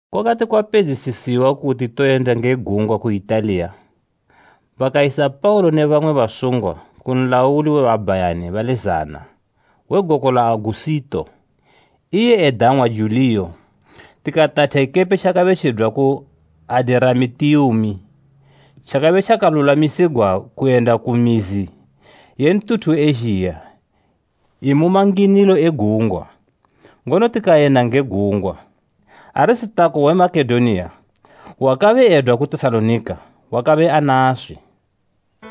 Kwakati kwapedzisisiwa kuti toyenda nge gungwa ku Italiya, bakayisa Paulo ne bamwe basungwa ku nlauli we babhayani bali zana “We goko la Agusito, iye edang'wa Juliyo.” Tikatatha ikepe tjakabe tjidwa ku Adiramitiumi, tjakabe tjakalulwamisigwa kuyenda ku mizi ye ntuthu we Ezhiya imu manginilo e gungwa, ngono tikayenda nge gungwa. Arisitako we Makedoniya wakabe edwa ku Tesalonika wakabe anaswi.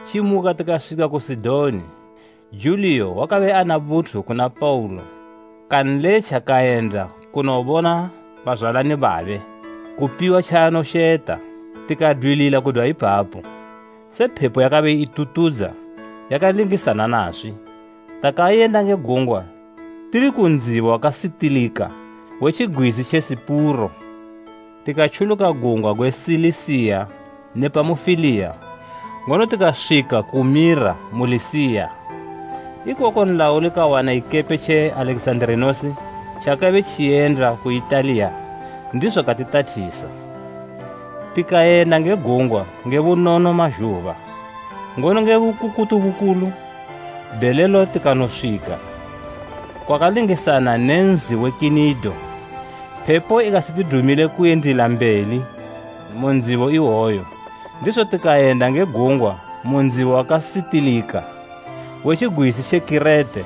Tjimuka tikaswika ku Sidoni. Juliyo wakabe ana buthu kuna Paulo kanletja kayenda kunobona bazwalani babe, kupiwa tjaanosheta. Tikadwilila kudwa ipapo, se phepo yakabe itutudza yakalingisana naswi, takayenda nge gungwa tili ku ndzibo wakasitilika we tjigwizi tje Sipuro. Tikatjuluka gungwa gwe Silisiya ne Pamufiliya ngono tikaswika ku Mira mu Lisiya. Ikoko nlauli kawana ikepe tje Alekizanda tjakabe tjiyenda ku Italiya, ndizo katitathisa. Tikayenda nge gungwa nge bunono mazhuba, ngono nge bukukutu bukulu bhelelo tikanoswika kwakalingisana ne nzi we Kinido. Phepo ikasitidumile kuyendila mbeli mu ndzibo iwoyo, ndizo tikayenda nge gungwa mu ndzibo wakasitilika we tjigwizi tje Kirete,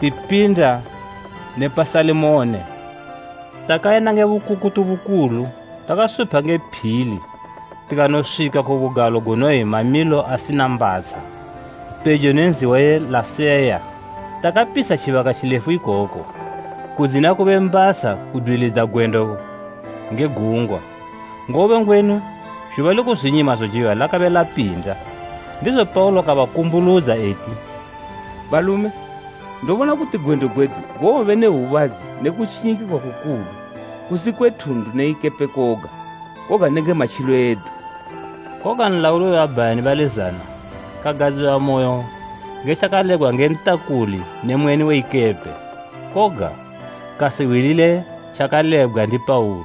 tipinda ne pa Salimone. Takayenda nge bukukutu bukulu takasupha nge phili tikanoswika ku bugalo gunoyi Mamilo asina Mbatsha, pejo ne nzi we Laseya. Takapitsha tjibaka tjilefu ikoko, kudzina kube mbatsha kudwilidza gwendo nge gungwa, ngobe ngwenu zhuba le kuzwinyima zojiwa lakabe lapinda. Ndizo Paulo kabakumbuludza eti, “Balume, ndobona kuti gwendo gwedu gowobe ne hwubadzi ne kutjinyikigwa kukulu kusi kwe thundu ne ikepe koga, koga nenge matjilo edu.” Koga nlauli we babhayani bali zana kagadziwamoyo nge tjakalebgwa nge ntakuli ne mweni we ikepe, koga, kasihwilile tjakalebgwa ndi Paulo.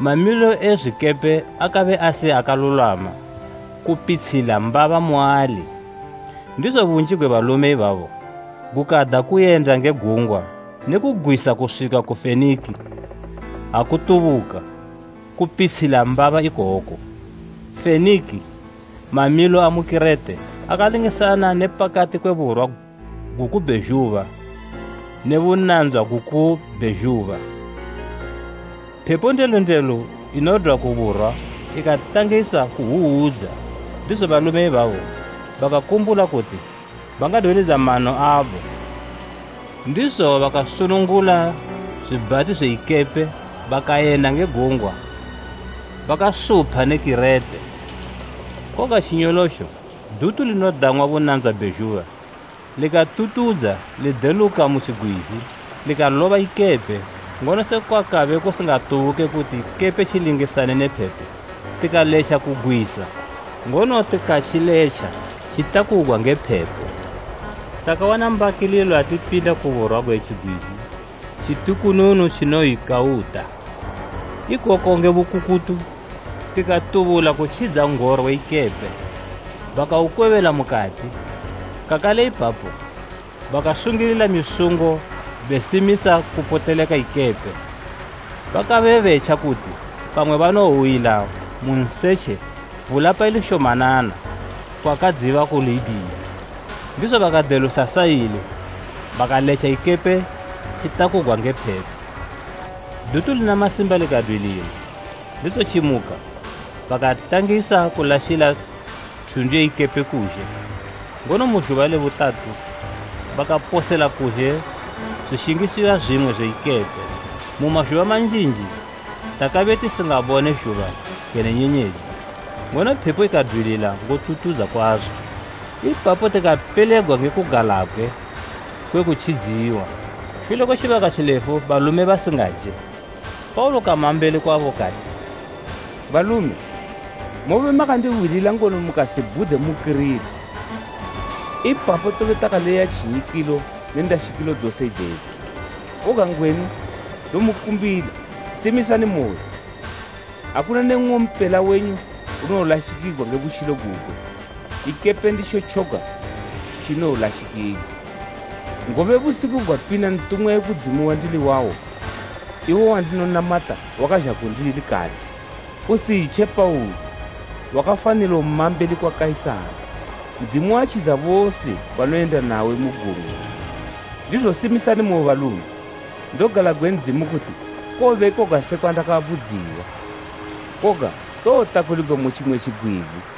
Mamilo e zwikepe akabe asi akalulwama kupitshila mbaba muali; ndizo bunji gwe balume ibabo gukada kuyenda nge gungwa ne kugwisa kuswika ku Fenikiya, akutubuka kupitshila mbaba ikoko. Fenikiya mamilo, amu Kirete akalingisana ne pakati kwe burwa guku bhezhuba ne bunandzwa guku bhezhuba. Phepo ndelu ndelu inodwa ku burwa ikatangisa kuhwuhwudza, ndizo balume ibabo bakakumbula kuti bangadwilidza mano abo, ndizo bakasunungula zwibhati zwe ikepe bakayenda nge gungwa bakasupha ne Kirete. Koga tjinyolotjo dutu linodang'wa “Bunandzwa bhezhuba” likatutudza lideluka mu tjigwizi. Ikaloba ikepe, ngono sekwa kabe kusingatubuke kuti ikepe tjilingisane ne phepo, tikaletja kugwisa, ngono tikatjiletja tjitakugwa nge phepo. Takawana mbakililo ha tipinda ku burwa nge tjigwizi tjitukununu tjinoyi Kauda. Ikoko nge bukukutu, tikatubula kutjidza n'goro we ikepe. Bakaukwebela mukati, kakale ipapo bakasungilila misungo besimisa kupoteleka ikepe. Bakabe betja kuti pamwe banowowila mu nsetje vula paili shomanana kwakadziba ku Libhiya, ndizo bakadelusa saile bakaletja ikepe tjitakugwa nge phepo. Dutu lina masimba likadwilila, ndizo tjimuka bakatangisa kulashila thundu ye ikepe kuzhe, ngono mu zhuba le butatu bakaposela kuzhe zwishingiswa zwimwe zwe ikepe. Mu mazhuba manjinji takabe tisingabone zhuba kene nyenyedzi, ngono phepo ikadwilila ngotutudza kwazo. Ipapo tikapelegwa nge kugalabgwe kwe kutjidziwa. Shule kwe tjibaka tjilefu balume basingaje, Paulo kama mbeli kwabo kati, “Balume, mobe makandihwilila ngono mukasibhude mu Kirete; ipapo tobe takaleya tjinyikilo ne ndashikilo dzose idzedzi. Koga ngwenu ndomukumbila, Simisani moyo! Akuna ne nng'ompela wenyu unowolashikigwa nge butjilo gugwe; ikepe nditjo tjoga tjinowolashikigwa. Ngobe busiku gwapinda ntumwa we kudzimu wandili wawo, iwo wandinonamata wakazha kundili kati, ‘Usitje Paulo! Wakafanilo ma mbeli kwa Kaisara. Ndzimu watjidza bose banoyenda nawe mu gungwa.’ Ndizo simisani moyo, balume! Ndogalabgwe Ndzimu kuti kowobe koga sekwa ndakabudziwa. Koga towotakuligwa mu tjimwe tjigwizi.”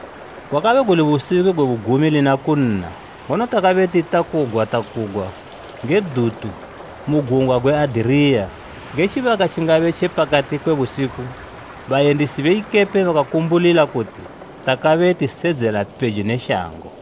Gwakabe guli busiku gwe bugumi lina kunna, ngono takabe titakugwatakugwa nge dutu mu gungwa gwe Adiriya. Nge tjibaka tjingabe tje pakati kwe busiku bayendisi be ikepe bakakumbulila kuti takabe tisedzela pejo ne shango.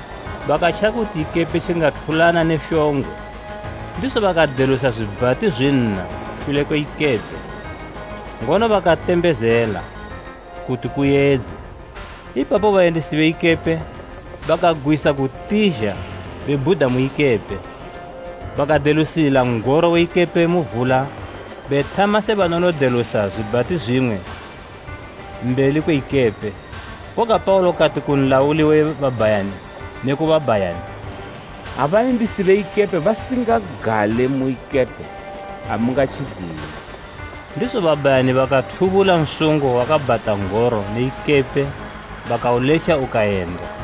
Bakatja kuti ikepe tjingathulana ne shongwe, ndizo bakadelusa zwibhati zwinna shule kwe ikepe, ngono bakatembezela kuti kuyedze. Ipapo bayendisi be ikepe bakagwisa kutizha bebhuda mu ikepe, bakadelusila n'goro we ikepe mu vula bethama se banonodelusa zwibhati zwimwe mbeli kwe ikepe. Koga Paulo kati ku nlauli we babhayani ne ku babhayani, “Ha bayendisi be ikepe basingagale mu ikepe, amungatjidziwe.” Ndizo babhayani bakathubula nsungo wakabhata n'goro ne ikepe bakauletja ukayenda.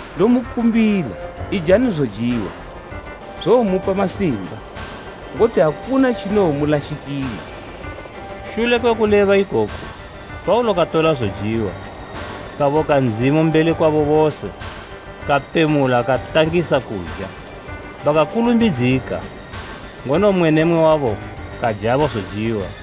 Ndomukumbila, ijani zojiwa; zowomupa masimba, ngoti akuna tjinowomulashikila.” Shule kwe kuleba ikoku, Paulo katola zojiwa, kaboka Ndzimu mbeli kwabo bose, kapemula katangisa kuja. Bakakulumbidzika, ngono mmwe ne mmwe wabo kajabo zojiwa.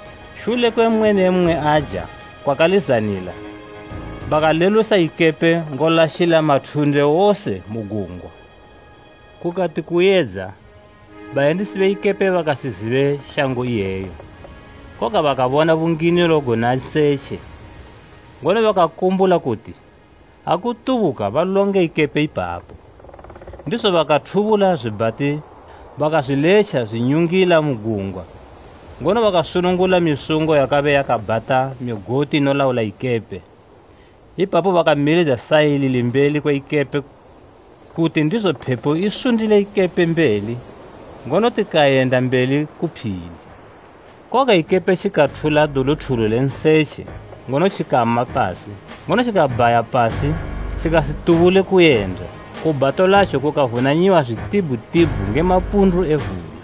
Shule kwe mmwe ne mmwe aja kwakalizanila, bakalelusa ikepe ngolashila mathunde wose mu gungwa. Kukati kuyedza, bayendisi be ikepe bakasizibe shango iyeyo, koga bakabona bunginilo guna nsetje, ngono bakakumbula kuti, akutubuka balonge ikepe ipapo. Ndizo bakathubula zwibhati bakazwiletja zwinyungila mu gungwa, ngono bakasunungula misungo yakabe yakabhata migoti inolaula ikepe. Ipapo bakamilidza saile limbeli kwe ikepe kuti ndizo phepo isundile ikepe mbeli, ngono tikayenda mbeli ku phili. Koga ikepe tjikathula duluthulu le nsetje ngono tjikama pasi; ngono tjikabhaya pasi tjikasitubule kuyenda, ku bhato latjo kukavunanyiwa zwitibhutibhu nge mapundu e vula.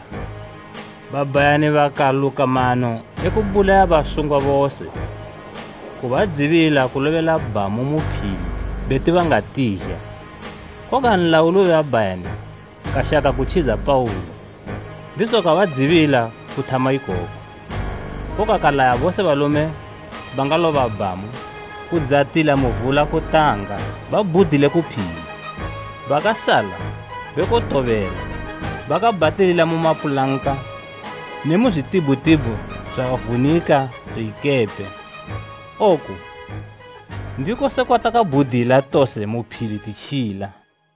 Babhayani bakaluka mano e kubulaya basungwa bose, kubadzibila kulobela bhamu ku phili beti bangatizha. Koga nlauli we babhayani kashaka kutjidza Paulo, ndizo kabadzibila kuthama ikoku. Koga kalaya bose balume bangaloba bhamu kudzatila mu vula kutanga babhudile ku phili; bakasala bekotobela, bakabhatilila mu mapulanka ne mu zwitibhutibhu zwavunika zwe ikepe. Oku ndiko sekwa takabhudila tose mu phili titjila.